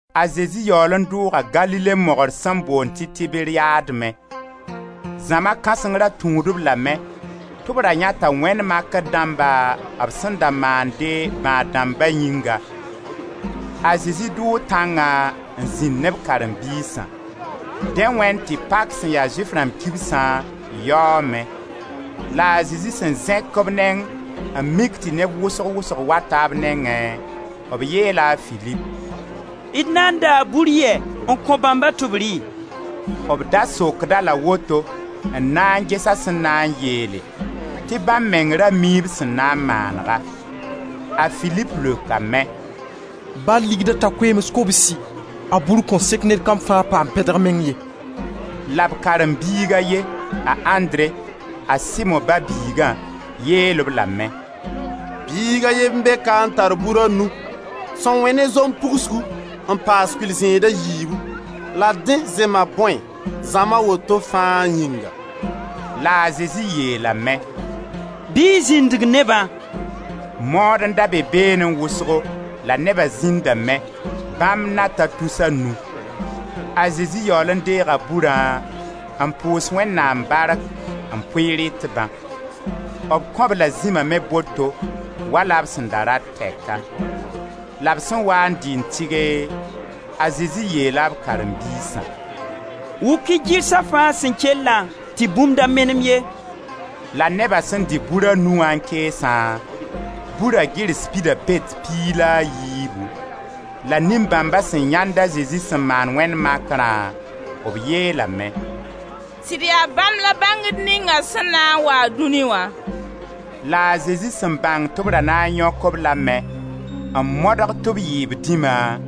A Zezi yaool n dʋʋga Galile mogr sẽn boond tɩ Tiberiyad me. Zãma kãseng ra tũud-b lame, tɩ b ra yãeta wẽnd makr dãmba b sẽn da maande bãad-dãmba yĩngã. A Zezi dʋʋ tãngã n zĩnd ne b karen-biisã. Dẽ wẽnd tɩ pak sẽn ya Zʋɩf rãmb kibsã yaoome. La a Zezi sẽn zẽk b neng n mik tɩ neb wʋsg wʋsg wata b nengẽ, b yeela a Filip: «D na n daa bur yɛ n kõ bãmba tɩ b rɩ?» B da sokd-a-la woto n na n ges a sẽn na n yeele, tɩ bãmb meng ra mii b sẽn na n maanega. A Filip leokame: «Ba ligda ta koeems kobsi, a bur kõn sek ned kam fãa paam pɛdg meng ye.» La b karen-biig a ye, a Andre, a Simo ba-biiga, yeel-b lame: «Biig a ye n be ka n tar bur a nu sẽn wẽ ne zom pugsgu n paas kʋɩl-zẽeda yiibu, la dẽ zema bõe zãma woto fãa yĩnga?» La a Zezi yeelame: «Bɩ y zĩndg nebã.» Mood n da be beenẽ wʋsgo la neba zĩndame, bãmb na ta tus a nu. A Zezi yaool n deega burã n pʋʋs Wẽnnaam bark n pʋɩ rɩtbã; b kõ-b-la zĩma me boto, wala b sẽn da rat tɛka. La b sẽn waa n dɩ n tɩge, a Zezi yeela b karen-biisã: «Wʋk-y gɩrsa fãa sẽn kellã tɩ bũmb da menem ye.» La neba sẽn dɩ bur a nu wã n keesã, bura gɩrs pida pet piig la yiibu. La nin-bãmba sẽn yãend a Zezi sẽn maan wẽnd makrã, b yeelame: «Sɩd yaa Bãmb la bãngd ninga sẽn na n waa dũni wã.» La a Zezi sẽn bãng tɩ b ra na n yõk-b lame n modg tɩ b yɩ b dĩma,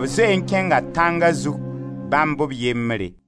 b zoe n kẽnga tãnga zug, bãmb b yembre.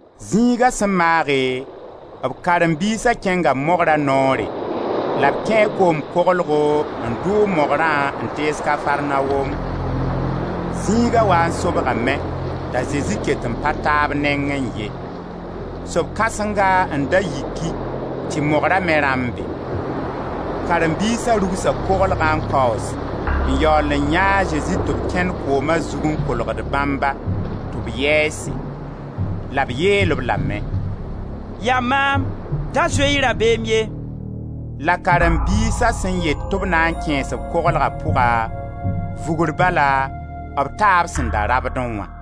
Zĩiga sẽn maage, b karen-biisa kẽnga mogra noore, la b kẽe koom-koglgo n dʋʋg mogrã n tees Kafarnaom. Zĩiga waa n sobgame, t'a Zezi ket n pa ta b nengẽ ye. Sob kãsenga n da yiki tɩ mogra me rãmbe. Karen-biisa rugsa koglgã n kaoos n yaool n yãe a Zezi tɩ b kẽnd kooma zug n kolgd bãmba, tɩ b yɛɛse. La b yeel-b lame: «Yaa maam, da zoe-y rabeem ye.» La karen-biisa sẽn yet tɩ b na n kẽes-b koglga pʋga, vugr bala b taa b sẽn da rabdẽ wã.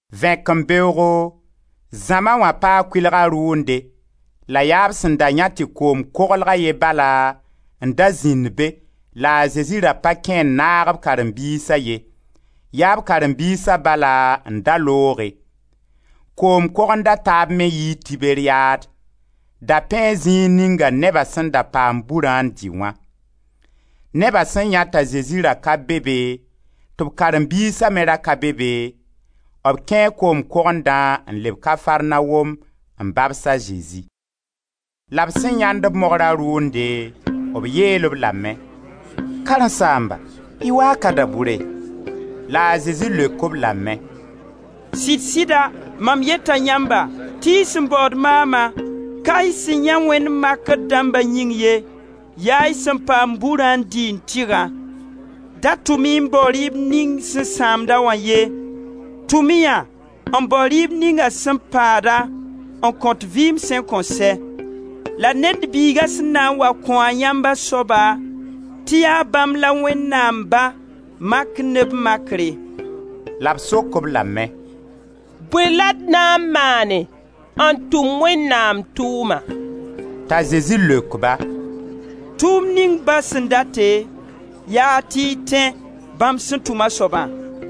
Vẽkembeoogo, zãma wã paa kʋɩlga rʋʋnde la yaa b sẽn da yãe tɩ koom koglg a ye bala n da zĩnd be la a Zezi ra pa kẽ n naag b karen-biisa ye, yaa b karen-biisa bala n da looge. Koom-kogend a taab me yii Tiberiyad: da pẽe zĩig ninga neba sẽn da paam burã n dɩ wã; neba sẽn yãe t'a Zezi ra ka be be tɩ b karen-biisa me ra ka be be, b kẽe koom-kogendã n leb Kafarnaom n babs a Zezi. La b sẽn yãend-b, mogra rʋʋnde, b yeel-b lame: «Karen-saamba, y waa ka da-bʋre?» La a Zezi leok-b lame: «Sɩd-sɩda mam yeta yãmba, tɩ y sẽn baood maama, ka y sẽn yãe wẽnd makr dãmba yĩng ye, yaa y sẽn paam burã n dɩ n tɩgã. Da tʋm-y n bao rɩɩb ning sẽn sãamda wã ye, tʋm yã n bao rɩɩb ninga sẽn paada, n kõt vɩɩm sẽn kõn sɛ; la Ned Biiga sẽn na n wa kõ-a yãmb a soaba, tɩ yaa bãmb la Wẽnnaam Ba mak ne b makre.» La b sok-b lame: «Bõe la d na n maane n tʋm Wẽnnaam tʋʋma?» T'a Zezi leok-ba: «Tʋʋmd ning Ba sẽn date, yaa tɩ y tẽ bãmb sẽn tʋm a soabã.»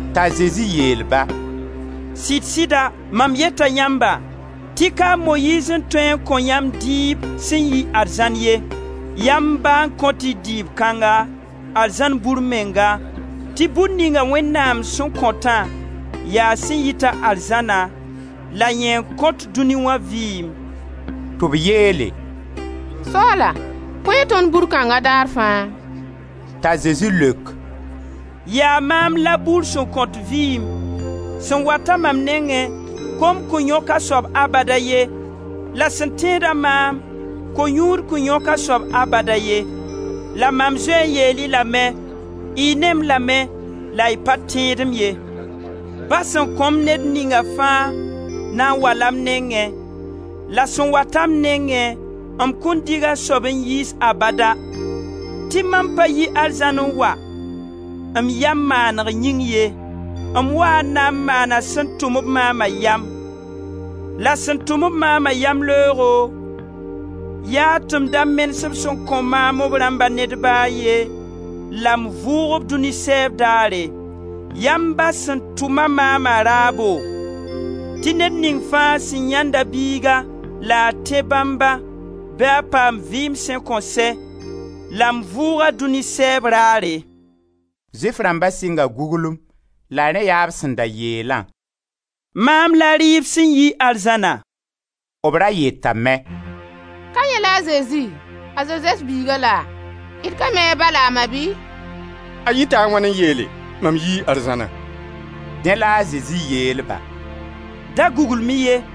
T'a Zezi yeel-ba: «Sɩd-sɩda mam yeta yãmba, tɩ ka a Moyiiz n tõe n kõ yãmb dɩɩb sẽn yi arzãn ye; yaa m Ba n kõt-y dɩɩb kãnga, arzãn bur menga; tɩ bur ninga Wẽnnaam sẽn kõtã, yaa sẽn yit-a arzãna, la yẽ n kõt dũni wa vɩɩm.» Tɩ b yeele: «Soaala, kõ-y tõnd bur kãnga daar fãa.» T'a Zezi leok: «Yaa maam la bur sẽn kõt vɩɩm. Sẽn wat-a mam nengẽ, kom kõn yõk a soab abada ye; la sẽn tẽed-a maam, ko-yũud kõn yõk a soab abada ye. La mam zoe n yeel-y lame: y ne-m lame, la y pa tẽed-m ye. Ba sẽn kõ-m ned ninga fãa na n wa-la m nengẽ, la sẽn wat-a m nengẽ, m kõn dig a soab n yiis abada; tɩ mam pa yi arzãn n wa, m yam maaneg yĩng ye, m waa n na n maana sẽn tʋm-b maama yam. La sẽn tʋm-b maama yamleoogo, yaa tɩ m da menes-b sẽn kõ maam b rãmba ned ba a ye, la m vʋʋg-b dũni sɛɛb daare. Yaa m Ba sẽn tʋma maama raabo, tɩ ned ning fãa sẽn yãenda Biiga la a tẽ bãmba bɩ a paam vɩɩm sẽn kõn sɛ, la m vʋʋg-a dũni sɛɛb raare.» Zʋɩf rãmba sɩnga guglengu, la rẽ yaa b sẽn da yeelã: «Maam la rɩɩb sẽn yi arzãna.» B ra yetame: «Ka yẽ la a Zezi, a Zozɛf biiga la? D ka mi a ba la a ma bɩ? A yɩta wãn n yeele: ‹Mam yii arzãna?›» Dẽ la a Zezi yeel-ba: «Da guglem-y ye.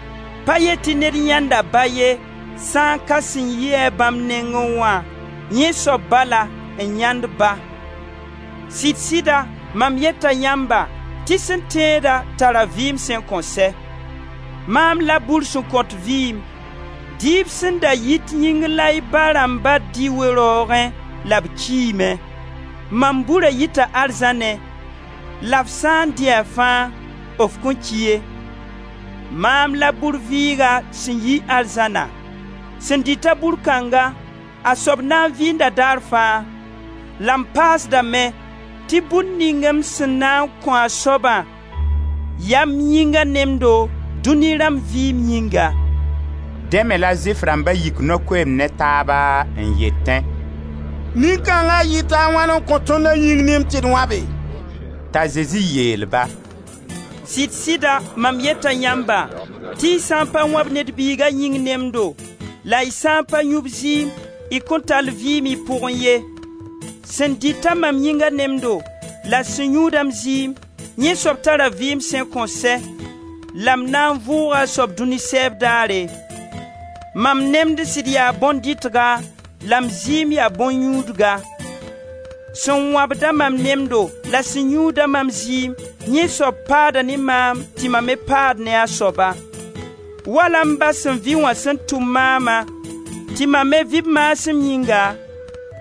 Pa yet tɩ ned yãenda Ba ye, sã n ka sẽn yi-a bãmb nengẽ wã, yẽ soab bala n yãend Ba. Sɩd-sɩda mam yeta yãmba tɩ sẽn tẽeda tar-a vɩɩm sẽn kõn sɛ. Mam la bur sẽn kõt vɩɩm. Dɩɩb sẽn da yit yĩngr la y ba rãmba dɩ we-raoogẽ la b kiime; Ma bura yita arzãnẽ, la f sã n dɩ-a fãa, f kõn ki ye. Maam la bur vɩɩga sẽn yi arzãna. Sẽn dɩta bur kãnga, a soab na n vɩɩnda daar fãa. La m paasdame tɩ bur ning m sẽn na n kõ a soabã, yaa m yĩngã nemdo, dũni rãmb vɩɩm yĩnga.» Dẽ me la Zʋɩf rãmba yik no-koeemd ne taaba n yetẽ: «Nin-kãnga yɩta a wãn n kõ tõnd a yĩng nemd tɩ d wãbe?» T'a Zezi yeel-ba: «Sɩd-sɩdsa mam yeta yãmba, tɩ y sã n pa wãb Ned Biiga yĩng nemdo, la y sã n pa yũ b zɩɩm, y kõn tall vɩɩm y pʋgẽ ye. Sẽn dɩt-a mam yĩnga nemdo, la sẽn yũud-a m zɩɩm, yẽ soab tara vɩɩm sẽn kõn sɛ, la m na n vʋʋga a soab dũni sɛɛb daare. Mam nemd sɩd yaa bõn-dɩtga la m zɩɩm yaa bõn-yũudga. Sẽn wãbd-a mam nemdo la sẽn yũud-a mam zɩɩm, yẽ soab paada ne maam tɩ mam me paad ne a soaba. Wala m Ba sẽn vɩ wã sẽn tʋm maama, tɩ mam me vɩ b maasem yĩnga,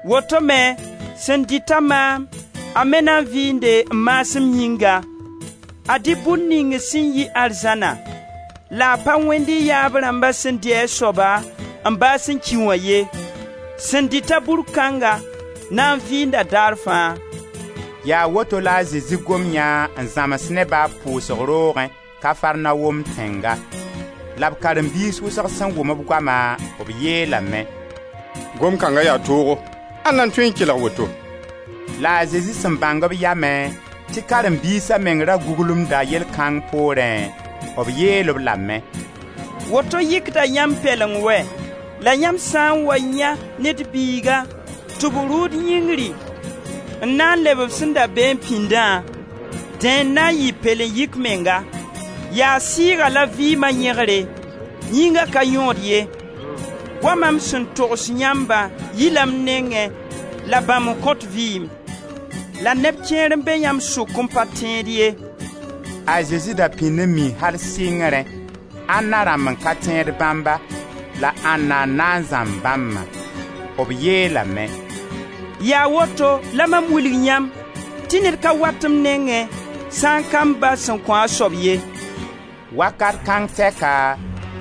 woto me sẽn dɩ-ta maam, a me na vɩɩnde m maasem yĩnga, Ad-y bur ning sẽn yi arzãna; la a pa wẽnd y yaab rãmb sẽn dɩ a soaba, n baas n ki wã ye; sẽn dɩta bur kãnga na n vɩɩnda daar fãa.» Yaa woto la a Zezi gom yã n zãms neba b pʋʋsg roogẽ Kafarnaom tẽnga. La b karen-biis wʋsg sẽn wʋm b goama, b yeelame: «Gomd kãnga yaa toogo, ãnda n tõe n kelg woto?» La a Zezi sẽn bãng b yamẽ tɩ karen-biisa meng ra guglemda yell kãng poorẽ, b yeel-b lame: «Woto yɩkda yãmb pɛleng wɛ? La yãmb sã n wa yãe Ned Biiga tɩ b rʋʋd yĩngri n na n leb b sẽn da beẽ pĩndã? Dẽ n na n yɩ pɛlen-yɩk menga. Yaa sɩɩga la vɩɩma yẽgre, yĩnga ka yõod ye. Goama m sẽn togs yãmbã yila m nengẽ la bãmb n kõt vɩɩm. La neb kẽer n be yãmb sʋk n pa tẽed ye.» A Zezi da pĩnd mi al sɩngrẽ, ãnna rãmb n ka tẽed bãmba la ãnna n na n zãmb bãmbã. B yeelame: «Yaa woto la mam wilg yãmb tɩ ned ka wat m nengẽ sã n ka m Ba sẽn kõ a soab ye.» Wakat kãng tɛka,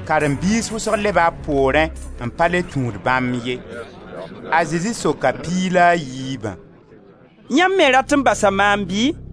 karen-biis wʋsg leba b poorẽ n pa le tũud bãmb ye. A Zezi soka piig la a yiibã: «Yãmb me rat n basa maam bɩ?»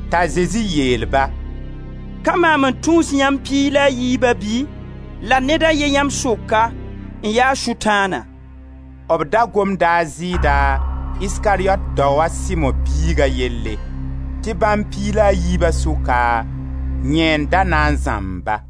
T'a Zezi yeel-ba: «Ka maam n tũus yãmb piig la a yiiba bɩ? La ned a ye yãmb sʋka n ya Sʋtãana.» B da gomda a Zɩɩda, Iskariyot dao a Simo biiga yelle, tɩ bãmb piig la yiiba sʋka yẽ n da na n zãmb-ba.